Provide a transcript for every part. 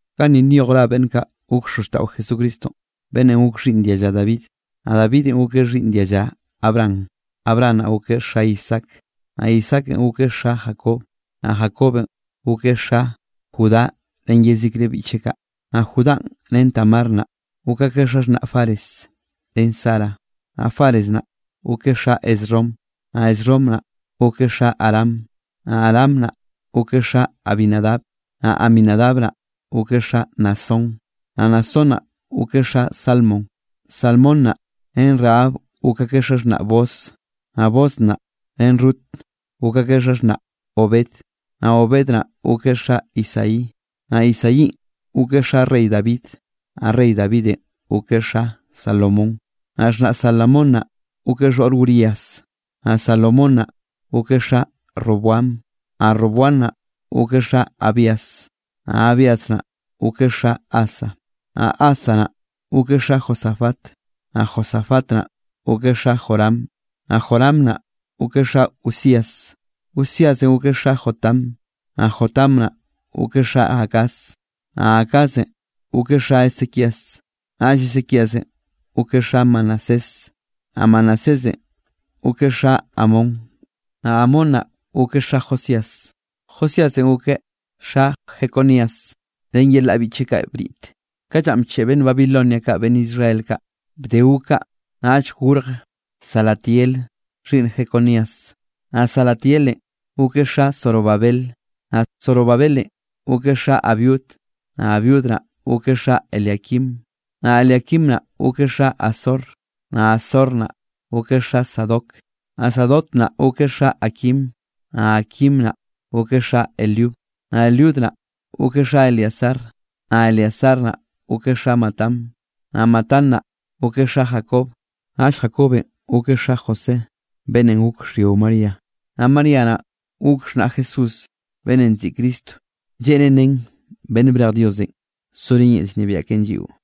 Ganni nyoj ra beꞌnn kaꞌ gok xozxtaꞌo Jesucristonꞌ, beꞌnnenꞌ gok Xhiꞌnn dialla David, naꞌ Davidenꞌ gokeꞌ xhiꞌnn dialla Abraham. Abraham naꞌ gokeꞌ xa Isaac, naꞌ Isaakenꞌ gokeꞌ xa Jacob, naꞌ Jacobenꞌ gokeꞌ xa Judá ren yezikre biꞌcheꞌ kaꞌ. Naꞌ Judánꞌ ren Tamar naꞌ, gok akeꞌ xaxhnaꞌ Fares ren Zara. Naꞌ Fares naꞌ gokeꞌ xa Esrom, naꞌ Esrom naꞌ gokeꞌ xa Aram. Naꞌ Aram naꞌ gokeꞌ xa Aminadab, naꞌ Aminadab naꞌ gokeꞌ xa Naasón, naꞌ Naasón naꞌ gokeꞌ xa Salmón. Salmón naꞌ, ren Rahab gok akeꞌ xaxhnaꞌ Booz. Naꞌ Booz naꞌ, ren Rut gok akeꞌ xaxhnaꞌ Obed. Naꞌ Obed naꞌ gokeꞌ xa Isaí. Naꞌ Isaínꞌ gokeꞌ xa rey David, naꞌ rey Davidenꞌ gokeꞌ xa Salomón. Naꞌ xhnaꞌ Salomón naꞌ gokeꞌ xhoꞌr Urías. Naꞌ Salomón naꞌ gokeꞌ xa Roboam, naꞌ Roboam naꞌ gokeꞌ xa Abías, naꞌ Abías naꞌ gokeꞌ xa Asa. Naꞌ Asa naꞌ gokeꞌ xa Josafat, naꞌ Josafat naꞌ gokeꞌ xa Joram, naꞌ Joram naꞌ gokeꞌ xa Uzías. Uzíasenꞌ gokeꞌ xa Jotam, naꞌ Jotam naꞌ gokeꞌ xa Acaz, naꞌ Acazenꞌ gokeꞌ xa Ezequías. Naꞌll Ezequíasenꞌ gokeꞌ xa Manasés, naꞌ Manasésenꞌ gokeꞌ xa Amón, naꞌ Amón naꞌ gokeꞌ xa Josías. Josíasenꞌ gokeꞌ xa Jeconías ren yelaꞌ biꞌcheꞌ kaꞌ bniꞌt, ka llanꞌ bcheꞌe beꞌnn Babilonia kaꞌ beꞌnn Israel kaꞌ. Bde gok kaꞌ, naꞌll gorje Salatiel xhiꞌnn Jeconías. Naꞌ Salatielenꞌ gokeꞌ xa Zorobabel. Naꞌ Zorobabelenꞌ gokeꞌ xa Abiud, naꞌ Abiud naꞌ gokeꞌ xa Eliaquim. Naꞌ Eliaquim naꞌ gokeꞌ xa Azor. Naꞌ Azor naꞌ gokeꞌ xa Sadoc, naꞌ Sadoc naꞌ gokeꞌ xa Aquim, naꞌ Aquim naꞌ gokeꞌ xa Eliud. Naꞌ Eliud naꞌ gokeꞌ xa Eleazar, naꞌ Eleazar naꞌ gokeꞌ xa Matán. Naꞌ Matán naꞌ gokeꞌ xa Jacob. Naꞌll Jacobenꞌ gokeꞌ xa José beꞌnnenꞌ gok xhyio María. Naꞌ María naꞌ gok xhnaꞌ Jesús beꞌnnenꞌ nziꞌi Cristo, lleꞌnen nen beꞌnn brej Diosenꞌ sorén yel llnebiaꞌ keꞌen lliꞌo.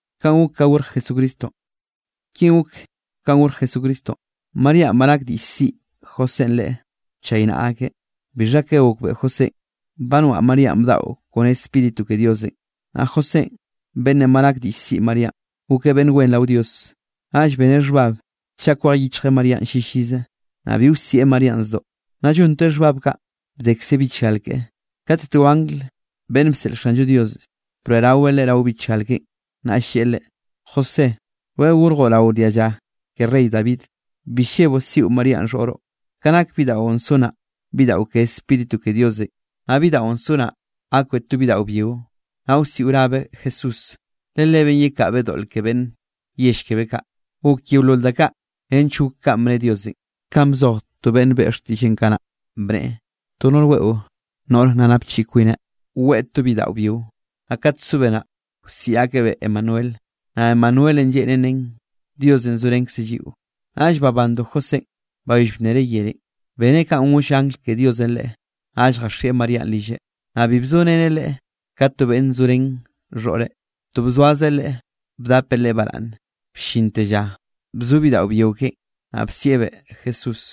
Kinꞌ gok kanꞌ gorj Jesucristonꞌ. Maríanꞌ ba nak diꞌll siꞌi Josénꞌ leꞌe wchaynaꞌa akeꞌ. Bixha ka gokbeꞌe Josénꞌ, ba noaꞌ Maríanꞌ bdaꞌo kone Spíritu ke Diosenꞌ. Naꞌ Josénꞌ beꞌnnenꞌ ba nak diꞌll siꞌi Maríanꞌ, gokeꞌ beꞌnn wen rao Dios. Naꞌll beneꞌ xhbab chaꞌ kwej yichjeꞌ Maríanꞌ llillize, naꞌ bi wsieꞌ Maríanꞌ zdoꞌ. Nna llonteꞌ xhbab kaꞌ, bdekze bichgal keꞌe, kate to angl beꞌnn bseꞌl Xanllo Dios, broeꞌraweꞌ leꞌe rao bichgal keꞌen, naꞌll lleꞌe leꞌe: —José, rweꞌ gorjoꞌ rao dialla ke rey David. Bi lleboꞌ siꞌo Maríanꞌ xhoꞌroꞌ, ka nak bidaꞌon so naꞌ, bidaꞌo ke Spíritu ke Diosenꞌ. Naꞌ bidaꞌon so naꞌ gakbeꞌ to bidaꞌo byio, naꞌ wsiꞌo rabeꞌ Jesús, le Lebeꞌn yekaꞌbeꞌ doꞌl ke beꞌnn yell kebeꞌ kaꞌ. Gok yeolol da kaꞌ nench gok kanꞌ bne Diosenꞌ, kanꞌ bzoj to beꞌnn beꞌe xtiꞌlleꞌn kanaꞌ, bneꞌe: To noꞌr weꞌo noꞌr nna napchiꞌi kwineꞌ, weꞌe to bidaꞌo byio. Naꞌ kat sobeꞌ naꞌ, wsiꞌi akebeꞌ Emanuel. Naꞌ Emanuelenꞌ lleꞌnen nen: Diosenꞌ zorenkzeꞌ lliꞌo. Naꞌll babando Josénꞌ, bayoll bnereꞌ yerenꞌ, beneꞌ kanꞌ goll angl ke Diosenꞌ leꞌe, naꞌll jaxieꞌ Maríanꞌ rilleꞌ. Naꞌ bi bzoreneꞌ leꞌe ka to beꞌnn zo ren xhoꞌreꞌ, to bzoazeꞌ leꞌe bdapeꞌ leꞌe baraꞌnne, bllinte lla bzo bidaꞌo byio keꞌen. Naꞌ bsieꞌbeꞌ Jesús.